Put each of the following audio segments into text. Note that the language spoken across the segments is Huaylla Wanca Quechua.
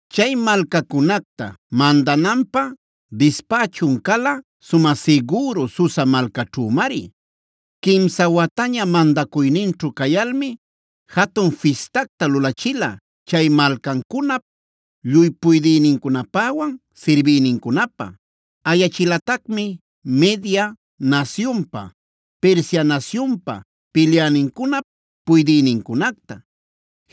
Chay malcacunacta mandananpä dispächun cala sumä sigüru Susa malcaćhümari. Quimsa wataña mandacuyninćhu cayalmi jatun fistacta lulachila chay malcancunap lluy puydïnincunapäwan sirbïnincunapä. Ayachilatacmi Media nasyunpa, Persia nasyunpa pilyänincunap puydïnincunacta,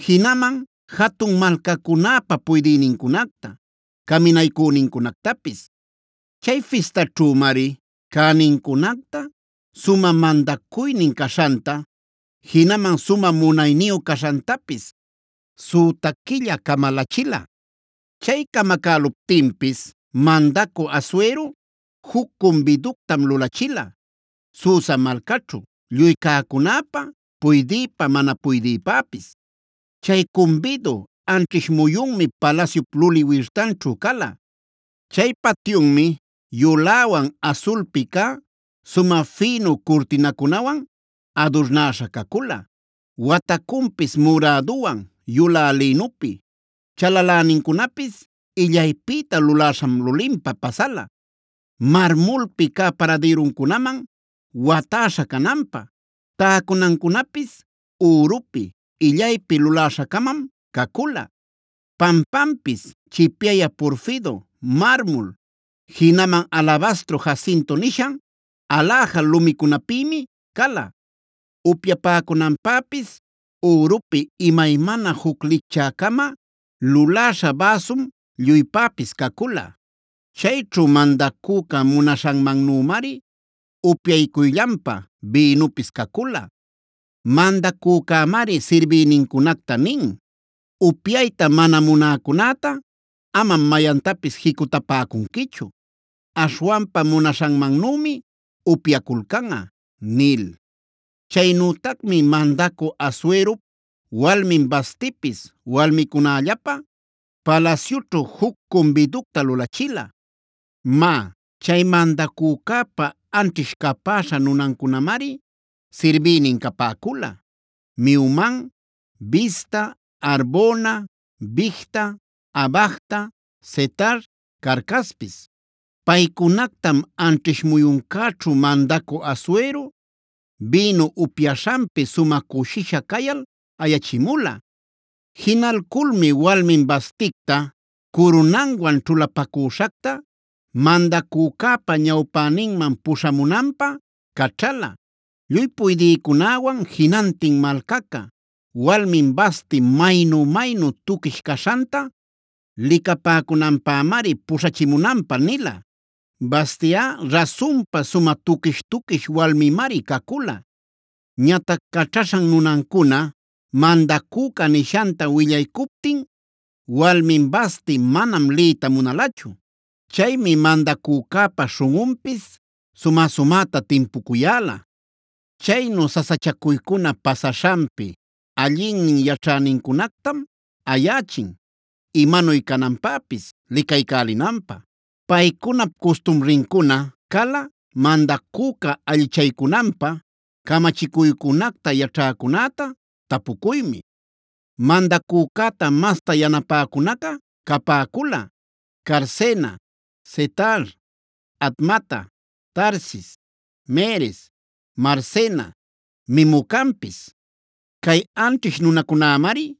jinaman jatun malcacunäpa puydïnincunacta, caminaycünincunactapis. Chay fistaćhümari cänincunacta, sumä mandacuynin caśhanta, jinaman sumä munayniyu caśhantapis süta quilla camalachila. Chay camacäluptinpis mandacü Asuero juc cumbiductam lulachila Susa malcaćhu lluy cäcunäpä puydïpä mana puydïpäpis. Chay cumbidu anćhish muyunmi palasyup luli wirtanćhu cala. Chay patyunmi yuläwan asulpi cä sumä fïnu curtïnacunawan adurnäśha cacula. Watacunpis muräduwan yulä lïnupi, chalalänincunapis illaypïta luläśham linlinpa pasala, marmulpi cä paradïruncunaman watäśha cananpä. Täcunancunapis ürupi illaypi luläśha-camam cacula. Pampanpis chipyayä porfido, marmul, jinaman alabastro jacinto nishan aläja lumicunapïmi cala. Upyapäcunanpäpis ürupi imaymana juc licchä-cama luläśha bäsum lluypäpis cacula. Chayćhu mandacüca munaśhanmannümari upyacuyllanpä bïnupis cacula. Mandacücämari sirbïnincunacta nin: “Upyayta mana munäcunäta amam mayantapis jicutapäcunquichu, aśhwanpa munaśhanmannümi upyaculcanꞌa” nil. Chaynütacmi mandacü Asuerop walmin Vastipis walmicunällapä palasyućhu juc cumbiducta lulachila. Má, chay mandacücäpa anćhish capäśha nunancunamari sirbïnin capäcula: Mehuman, Bizta, Harbona, Bigta, Abagta, Zetar, Carcaspis. Paycunactam anćhish muyuncäćhu mandacü Asuero bïnu upyaśhanpi sumä cushisha cayal ayachimula. Jinalculmi walmin Vasticta curunanwan ćhulapacüśhacta mandacücäpa ñawpäninman puśhamunanpä caćhala. Lluy puydïcunäwan jinantin malcaca, walmin Vasti maynu-maynu tuquish caśhanta licapäcunanpämari puśhachimunanpä nila. Vastiꞌa rasunpa sumä tuquish-tuquish walmimari cacula. Ñatac caćhaśhan nunancuna mandacüca nishanta willaycuptin walmin Vasti manam liyta munalachu. Chaymi mandacücäpa śhunꞌunpis sumä-sumäta timpucuyäla. Chaynu sasachacuycuna pasaśhanpi allinnin yaćhänincunactam ayächin imanuy cananpäpis licaycälinanpä. Paycunap custumrincuna cala mandacüca allichaycunanpä camachicuycunacta yaćhäcunäta tapucuymi. Mandacücäta masta yanapäcunaca capäcula: Carsena, Setar, Admata, Tarsis, Meres, Marsena, Memucanpis. Cay anćhish nunacunämari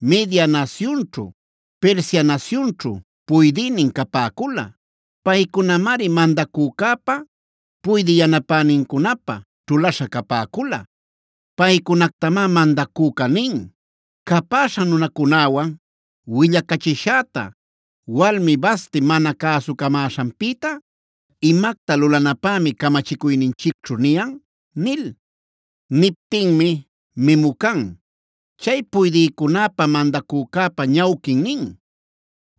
Media nasyunćhu, Persia nasyunćhu puydïnin capäcula. Paycunamari mandacücäpa puydï yanapänincunapä ćhulaśha capäcula. Paycunactamá mandacüca nin: “Capäśha nunäcunawan willacachishäta walmí Vasti mana cäsucamäśhanpïta, ¿imacta lulanapämi camachicuyninchicćhu niyan?” nil. Niptinmi Memucan, chay puydïcunäpa mandacücäpa ñawquin nin: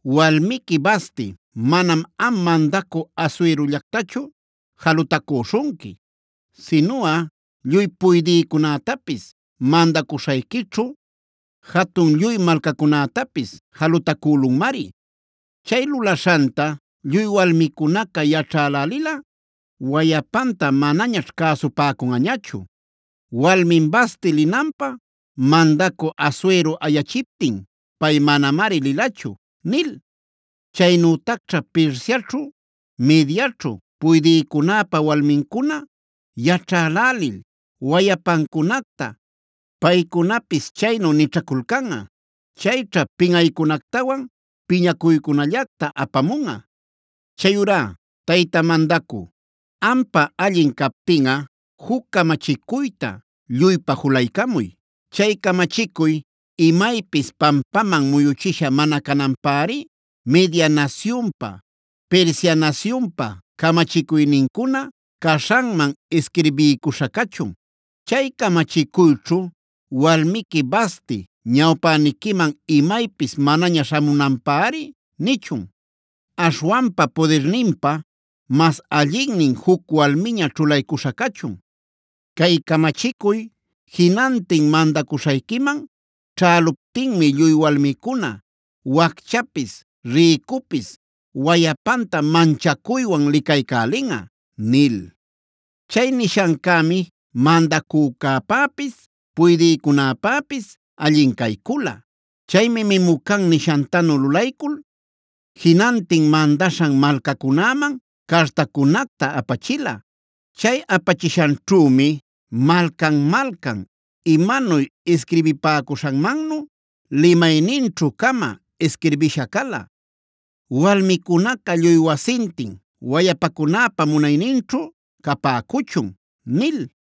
“Walmiqui Vasti, manam am mandacü Asuerollactachu jalutacüśhunqui, sinuꞌa lluy puydïcunätapis, mandacuśhayquićhu jatun lluy malcacunätapis jalutacülunmari. Chay lulaśhanta lluy walmicunaca yaćhälälilꞌa, wayapanta manañaćh cäsupäcunꞌañachu: ‘Walmin Vasti linanpä mandacü Asuero ayachiptin, pay manamari lilachu’ nil. Chaynütacćha Persiaćhu, Mediaćhu puydïcunäpa walmincuna yaćhälälil wayapancunacta paycunapis chaynu nićhaculcanꞌa. Chayćha pinꞌaycunactawan piñacuycunallacta apamunꞌa. “Chayurá tayta mandacü, ampä allin captinꞌa juc camachicuyta lluypä julaycamuy. Chay camachicuy imaypis pampaman muyuchisha mana cananpäri Media nasyunpa, Persia nasyunpa camachicuynincuna caśhanman isquirbiycuśha cachun.b Chay camachicuyćhu walmiqui Vasti ñawpäniquiman imaypis manaña śhamunanpäri nichun. Aśhwanpa pudirninpä mas allinnin juc walmiña ćhulaycuśha cachun. Cay camachicuy jinantin mandacuśhayquiman ćhäluptinmi lluy walmicuna wacchapis, rïcupis wayapanta manchacuywan licaycälinꞌa” nil. Chay nishancämi mandacücäpäpis puydïcunäpäpis allin caycula. Chaymi Memucan niśhantanu lulaycul, jinantin mandaśhan malcacunäman cartacunacta apachila. Chay apachishanćhümi malcan-malcan imanuy isquirbipäcuśhanmannu, limayninćhu-cama isquirbisha cala: “Walmicunaca lluy wasintin wayapacunäpa munayninćhu capäcuchun” nil.